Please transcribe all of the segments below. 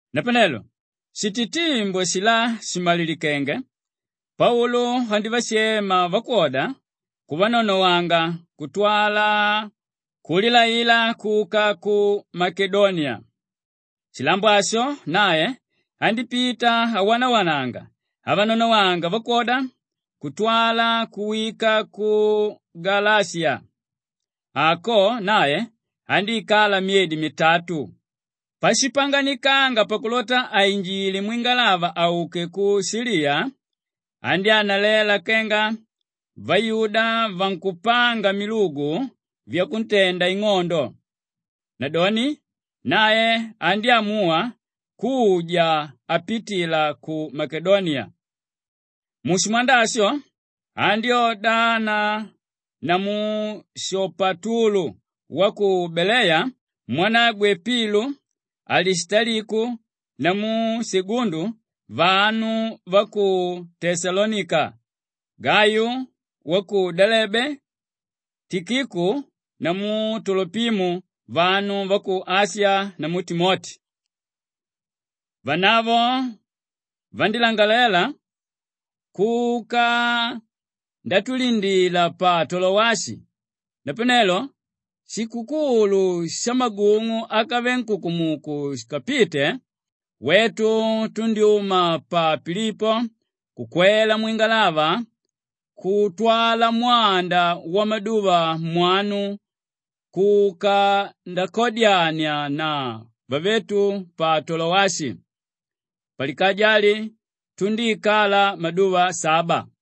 Napanelo shititimbu ashilá shìmalilikenge, Paulu andívashema vakwoda kuvanonowanga kutwala kulilaila kuka ku Makedoniya. Shilambo asho nae andípita awanawananga avananonowanga vakwoda kutwala kuwika ku Galashiya. Ako nae andíikala myedi mitatu. Pashipanganikanga pakulota ainjile mwingalava auke ku Shiliya, andyánalela kenga vayuda vankupanga milugu vyakuntenda ing'ondo. Nadoni nae andyámuwa kuja apitila ku Makedoniya. Mushimwanda asho andyódana namu Shopatulu wa ku Beleya mwanagwe Pilu, Alishitaliku namu Segundu vanu va ku Teshalonika, Gayu wa ku Delebe, Tikiku namu Tolopimo vanu va ku Ashiya namu Timoti. Vanavo vandílangalela kuka ndatulinda pa Tolowashi. Napanelo shikukulu shamagung'u ákave nkukumuku shikapite, wetu tundyúma pa Pilipo kukwela mwingalava kutwala mwanda wamaduva mwanu kuka ndakadyania na vavetu pa Tolowashi. Palikaja ali tundíikala maduva saba.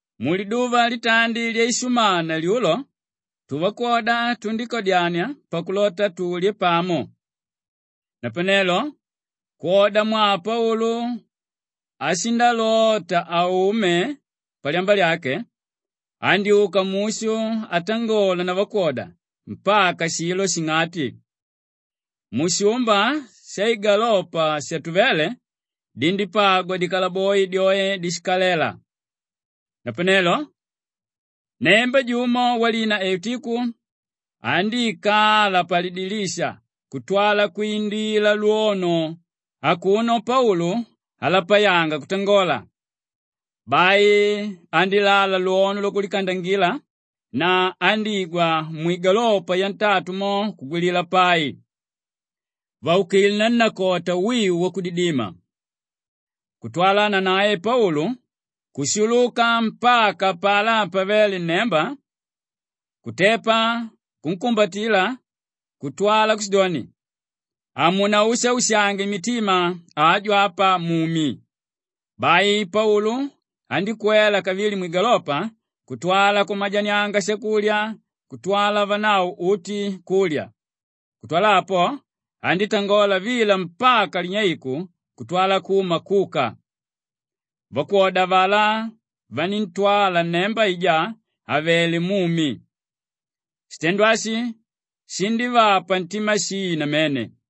Muliduva litandi lyaishumana lyulo tuvakwoda tundíkadyania pakulota tulye pamo. Napanelo kwodamwaa Paulu ashindalota aume palyamba lyake, andyúka mushu atangola na vakwoda mpaka shilo shing'ati. Mushumba shaigalopa shatuvéle dindípagwa dikalaboi dyoe dishikalela. Napanelo nnemba jumo walina Eutiku andíikala palidilisha kutwala kwindila lwono akuno Paulu alapayanga kutangola. Bai andílala lwono lwakulikandangila na andígwa mwigalopa yantatu mo kugwilila pai; vaukilé nannakota wiu wakudidima. Kutwala nanae Paulu kushuluka mpaka apalá pavéle nnemba, kutepa kunkumbatila kutwala kushidoni, “Hamunaushaushange mitima, aju apa mumi.” Bai Paulu andíkwela kavili mwigalopa kutwala kumajanianga shakulya kutwala vanavo uti kulya. Kutwala apo, andítangola vila mpaka linyeiku kutwala kuma kuka. Vakwoda avalá vaníntwala nnemba aijá àvele mumi. Shitendo ashi shindívapa ntima shii namene.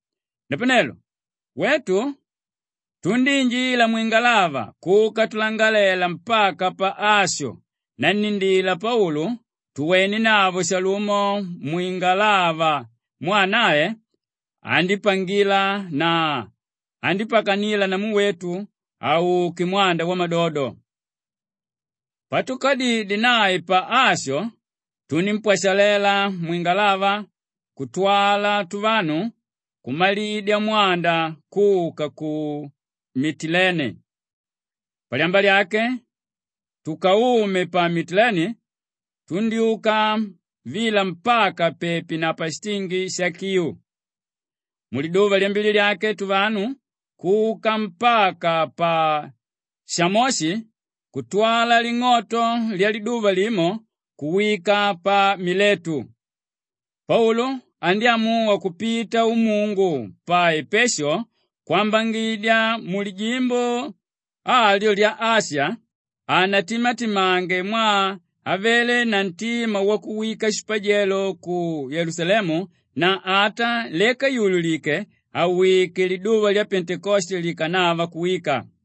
Napanelo wetu tundíinjila mwingalava kuka tulangalela mpaka pa Asho nannindila Paulu tuwenenavo shalumo mwingalava mwaa nae andípangila na andípakanila namu wetu auke mwanda wamadodo. Patukadidye nae pa Asho, tunímpwashalela mwingalava kutwala tuvanu kumalidya mwanda kuka ku Mitileni. Palyamba lyake tukaume pa Mitileni tundyúka vila mpaka pepi na pashitingi sha Kiu. Muliduva lyambili lyake tuvanu kuka mpaka pa Shamoshi kutwala ling'oto lyaliduva limo kuwika pa Miletu. Paulu andyámuwa kupita umungu pa Epeshu kwambangidya mulijimbo alyo lya Ashiya hanatimatimange mwaa avele na ntima wakuwika shipajelo ku Yelusalemu na ata leka yùlulike awike liduva lya Pentekoste likanava kuwika.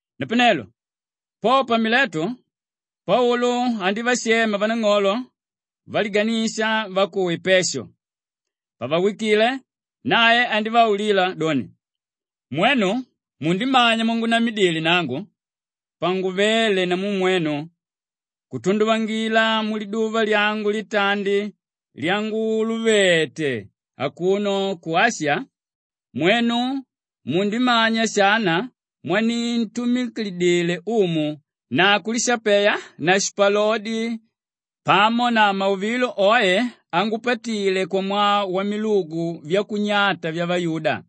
Napanelo po pa Miletu, Paulu andívashema vanang'olo valiganisha va ku Epeshu. Pavawikile nae andívaulila doni, “Mwenu mundimanya mwangunamidile nangu panguvéle namu mwenu kutunduvangila muliduva lyangu litandi lyanguluvete akuno ku Ashiya. Mwenu mundimanya shana mwanintumikidile Umu na kulishapeya na shipalodi pamo na mauvilo oe angupatile kwamwaa wamilugu vyakunyata vyavayuda.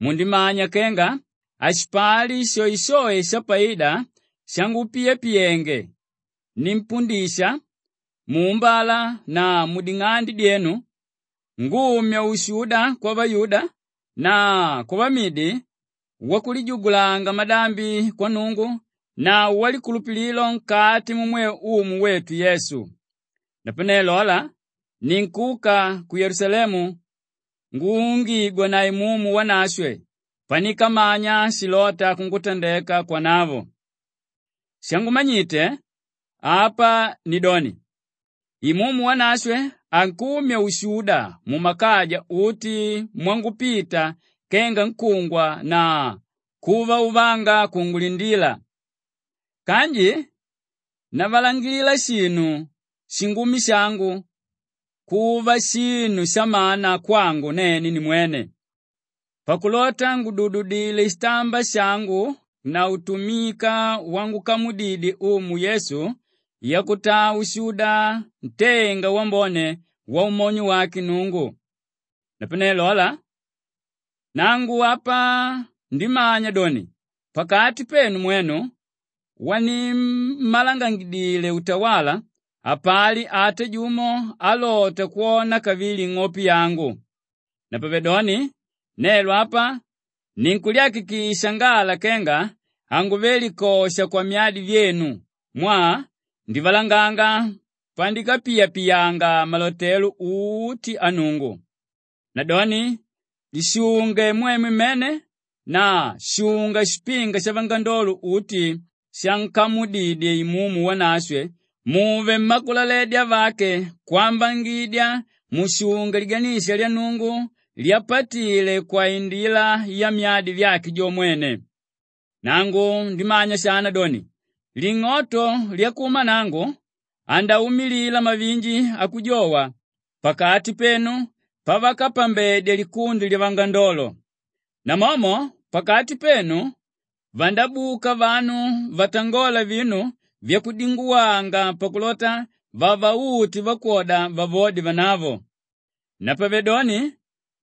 Mundimanya kenga hashipali shoeshoe shapaida shangupiyapiyenge; nimpundisha muumbala na muding'ande dyenu ngumya ushuda kwavayuda na kwavamidi wakulijugulanga madambi kwa Nnungu na walikulupililo nkati mumwe Umu wetu Yesu. Maandiko anji akala vandyanjedya, …Klistu. Napanelo lola, ninkuka ku Yelusalemu nguungigwa na Imumu Wanashwe panikamanya shilóta kungutandeka kwanavo. Shangumanyite apa nidoni, Imumu Wanashwe ankumya ushuda mumakaja uti mwangupita kenga kungwa na kuvauvanga kunkungulindila. Kanji navalangilila shinu shingumi shangu kuva shinu shamana kwangu nene nimwene pakulota ngudududile shitamba shangu na utumika wangukamudidye Umu Yesu yakutaa ushuda ntenga wambone waumonyo wake Nnungu. “Napanelo lola, nangu apa ndimanya doni pakati penu mwenu wanimmalangangidile utawala, hapali ata jumo álota kwona kavili ing'ope yangu. Napavedoni nelo apa ninkulyakikisha ngala kenga hanguve likosha kwamyadi vyenu mwaa ndivalanganga panikapiyapiyanga malotelo uti a Nnungu. Nadoni lishunge mwemwe mmene na shunga shipinga shavangandolo uti shankamudidye Imumu Wanashwe muve mmakulaledya vake kwambangidya mushunge liganisha lya Nnungu lyapatile kwaindila yamyadi vyake jo mwene. Nangu ndimanya shana doni, ling'oto lyakuma nangu andaumilila mavinji akujowa pakati penu pavakapambedya likundi lyavangandolo. Namomo pakati penu vandabuka vanu vatangola vinu vyakudinguwanga pakulota vavaute vakwoda vavode vanavo. Napavedoni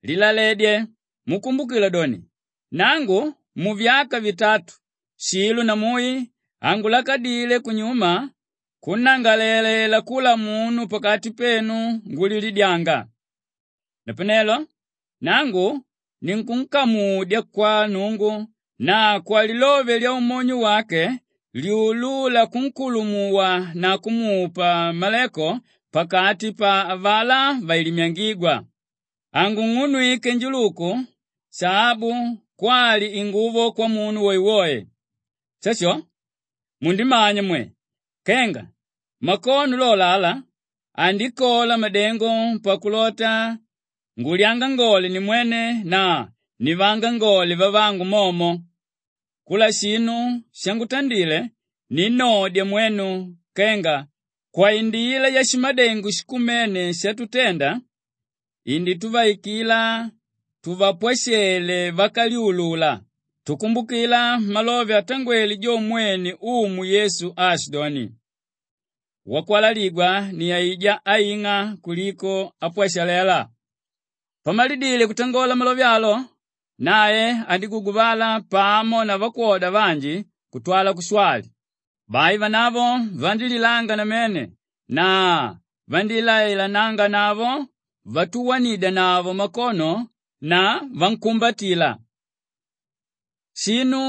lilaledye mukumbukila doni, nangu muvyaka vitatu shilo na mui hangulakadile kunyuma kunnangalalela kula munu pakati penu ngulilidyanga. “Napanelo nangu ninkunkamudya kwa Nnungu na kwalilove lyaumonyo wake lyulúla kunkulumuwa na kumupa maleko pakati pa avalá vailimyangígwa. Hangung'unwike njuluku, shaabu kwali inguvo kwamunu woewoe. Shasho! Mundimanya mwe, kenga makono lolo ala andikola madengo pakulota ngulyangangole nimwene na nivaangangole vavangu momo. Kula shinu shangutandile, ninnodya mwenu kenga kwaindila yashimadengo shikumene shatutenda indituvaikila tuvapwashele vákalyulula tukumbukila malove atangwele jo mwene Umu Yesu aashidoni, ‘Wakwalaligwa ni aijá áing'a kuliko ápwashalela.’” Pamalidile kutangola malove alo nae andíguguvala pamo na vakwoda vanji kutwala kushwali. Bai vanavo vandílilanga namene na vandílailananganavo vatuwanidyanavo makono na vankumbatila. Shinu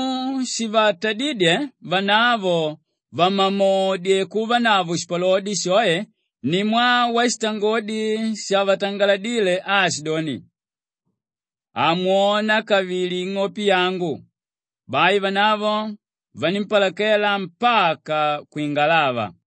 shivatadídye vanavo vamamodye kuvanavo shipalodi shoe ni mwaa washitangodi shavatangaladile aashidoni, “Hamwona kavili ing'ope yangu.” Bai vanavo vanímpalakela mpaka kwingalava.